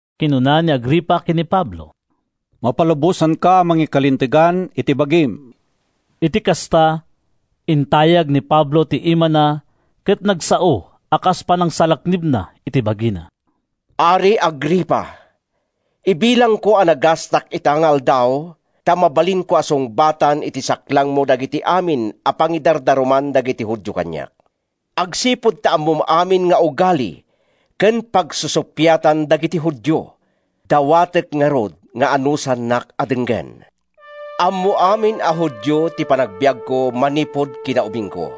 Kinuna ni Agripa ken ni Pablo, “Mapalubosanka a mangikalintegan iti bagim.” Iti kasta, intayag ni Pablo ti imana ket nagsao a kas panangsalaknibna iti bagina: “Ari Agripa! Ibilangko a nagasatak ita nga aldaw ta mabalinko a sungbatan iti saklangmo dagiti amin a pangidardaruman dagiti Judio kaniak. Agsipud ta ammom amin nga ugali ken pagsusuppiatan dagiti Judio, dawatek ngarud nga anusannak a denggen. “Ammo amin a Judio ti panagbiagko manipud kinaubingko.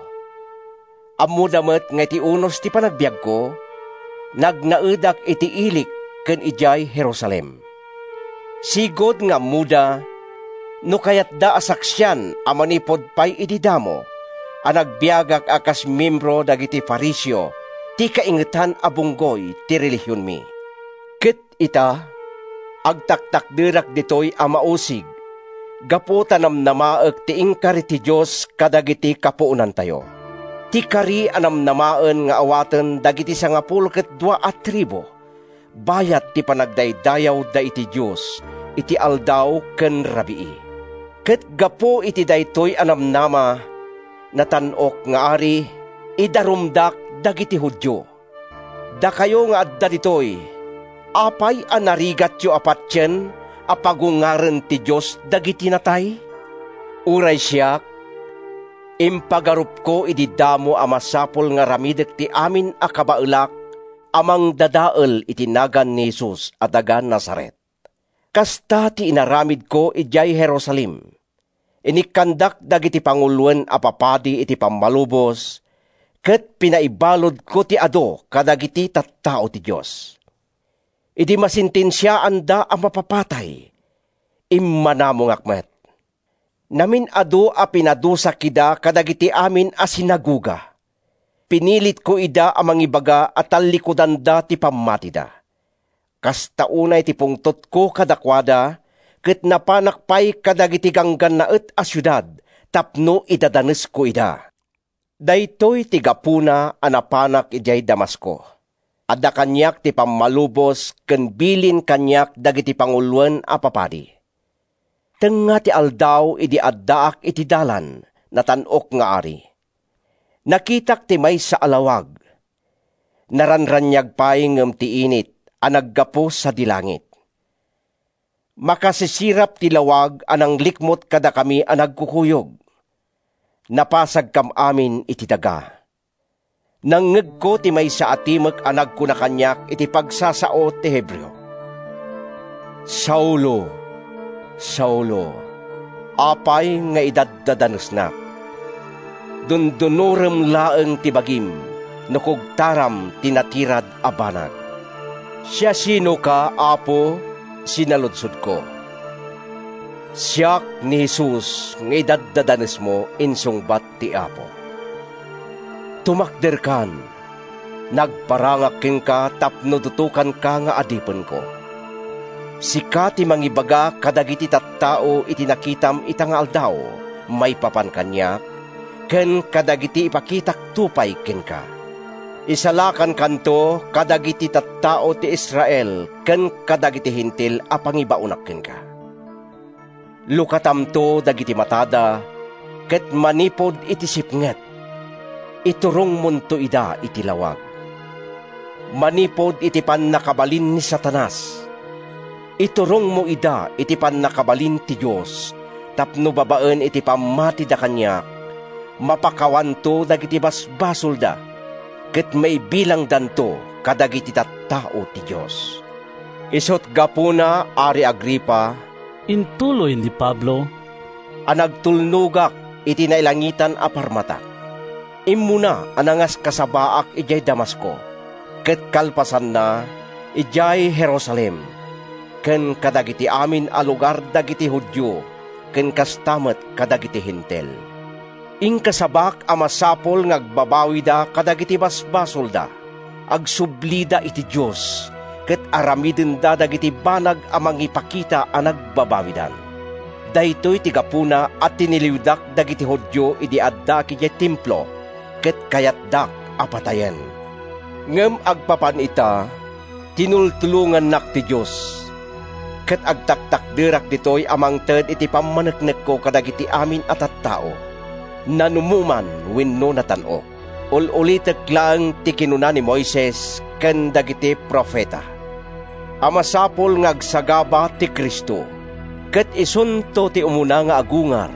Ammoda met nga iti unos ti panagbiagko, nagnaedak iti ilik ken idiay Jerusalem. Sigud nga ammoda, no kayatda a saksian a manipud pay idi damo, a nagbiagak a kas miembro dagiti Fariseo, ti kaingetan a bunggoy ti relihionmi. Ket ita, agtaktakderak ditoy a mausig gapu ta namnamaek ti inkari ti Dios kadagiti kapuonantayo, ti kari a namnamaen nga awaten dagiti sangapulo ket dua a tribu bayat ti panagdaydayawda iti Dios iti aldaw ken rabii. Ket gapu iti daytoy a namnama, Natan-ok nga Ari, idarumdak dagiti Judio. Dakayo nga adda ditoy, apay a narigatyo a patien a pagungaren ti Dios dagiti natay? “Uray siak, impagarupko idi damo a masapul nga aramidek ti amin a kabaelak a mangdadael iti nagan ni Jesus a taga-Nazaret. Kasta ti inaramidko idiay Jerusalem. Inikkandak dagiti panguloen a papadi iti pammalubos ket pinaibaludko ti adu kadagiti tattao ti Dios. Idi masentensiaanda a mapapatay, immanamongak met. Namin-adu a pinadusak ida kadagiti amin a sinagoga; pinilitko ida a mangibaga a tallikudanda ti pammatida. Kasta unay ti pungtotko kadakuada, ket napanak pay kadagiti ganggannaet a siudad tapno idadanesko ida.” “Daytoy ti gapuna a napanak idiay Damasco. Adda kaniak ti pammalubos ken bilin kaniak dagiti panguloen a papadi. Tengnga ti aldaw idi addaak iti dalan, Natan-ok nga Ari. Nakitak ti maysa a lawag—naranraniag pay ngem ti init—a naggapu sadi langit. Makasisirap ti lawag a nanglikmut kadakami a nagkukuyog. Napasagkam amin iti daga. Nangngegko ti maysa a timek a nagkuna kaniak iti pagsasao iti Hebreo, ‘Saulo, Saulo! Apay nga idaddadanesnak? Dundunorem laeng ti bagim no kugtaram ti natirad a banag.’ “‘Siasinoka, Apo?’ sinaludsodko. ‘Siak ni Jesus nga idaddadanesmo,’ insungbat ti Apo. ‘Tumakderkan. Nagparangak kenka tapno dutokanka nga adipenko. Sika ti mangibaga kadagiti tattao iti nakitam ita nga aldaw maipapan kaniak ken kadagiti ipakitakto pay kenka. Isalakankanto kadagiti tattao ti Israel ken kadagiti Hentil a pangibaonak kenka. Lukatamto dagiti matada, ket manipud iti sipnget, iturongmonto ida iti lawag. Manipud iti pannakabalin ni Satanas, iturongmo ida iti pannakabalin ti Dios tapno babaen iti pammatida kaniak, mapakawanto dagiti basbasolda ket maibilangdanto kadagiti tattao ti Dios.’” “Isut’ gapuna, Ari Agripa,” intuloy ni Pablo, “a nagtulnogak iti nailangitan a parmatak. Immuna a nangaskasabaak idiay Damasco, ket kalpasanna, idiay Jerusalem ken kadagiti amin a lugar dagiti Judio ken kasta met kadagiti Hentil. Inkasabak a masapul nga agbabawida kadagiti basbasolda, agsublida iti Dios ket aramidenda dagiti banag a mangipakita a nagbabawidan. Daytoy ti gapuna a tiniliwdak dagiti Judio idi addaak idiay Templo ket kayatdak a patayen. Ngem agpapan ita, tinultulongannak ti Dios, ket agtaktakderak ditoy a mangted iti pammaneknekko kadagiti amin a tattao, nanumo man wenno natan-ok. Ul-ulitek laeng ti kinuna ni Moises ken dagiti profeta a masapul nga agsagaba ti Cristo, ket isunto ti umuna nga agungar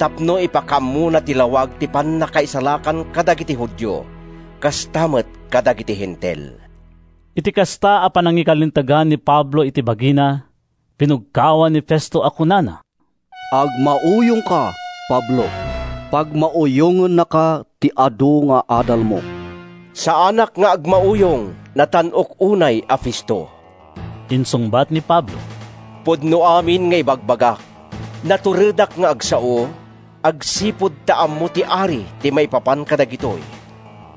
tapno ipakaammona ti lawag ti pannakaisalakan kadagiti Judio kasta met kadagiti Hentil.” Iti kasta a panangikalintegan ni Pablo iti bagina, binugkawan ni Festo a kunana, “Agmauyongka, Pablo. Pagmauyongennaka ti adu nga adalmo.” “Saanak nga agmauyong, natan-ok unay a Festo,” insungbat ni Pablo. “Pudno amin nga ibagbagak. Naturedak nga agsao, agsipud ta ammo ti ari ti maipapan kadagitoy.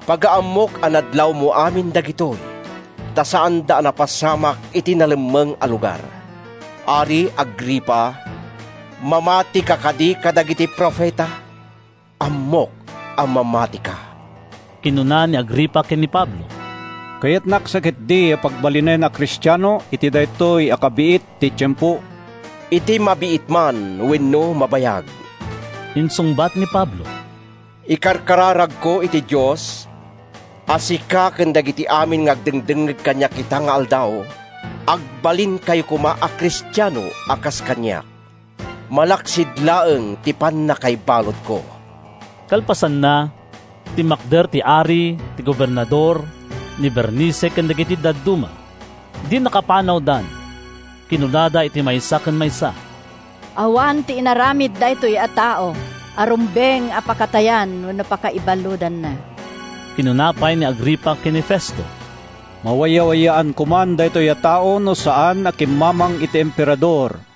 Pagaammok a nadlawmo amin dagitoy, ta saanda a napasamak iti nalemmeng a lugar. Ari Agripa, mamatika kadi kadagiti profeta? Ammok a mamatika!” Kinuna ni Agripa ken ni Pablo, “Kayatnak sa ketdi a pagbalinen a Kristiano iti daytoy a kabiit ti tiempo.” “Iti mabiit man wenno mabayag,” insungbat ni Pablo, “ikarkararagko iti Dios a sika ken dagiti amin nga agdengdengngeg kaniak ita nga aldaw, agbalinkayo koma a Kristiano a kas kaniak—malaksid laeng ti pannakaibaludko!” Kalpasanna, timmakder ti ari, ti gobernador, ni Bernice ken dagiti dadduma. Idi nakapanawdan, kinunada iti maysa ken maysa, “Awan ti inaramid daytoy a tao a rumbeng a pakatayan wenno pakaibaludanna.” Kinuna pay ni Agripa ken ni Festo, “Mawayawayaan koman daytoy a tao no saan a kimmamang iti Emperador.”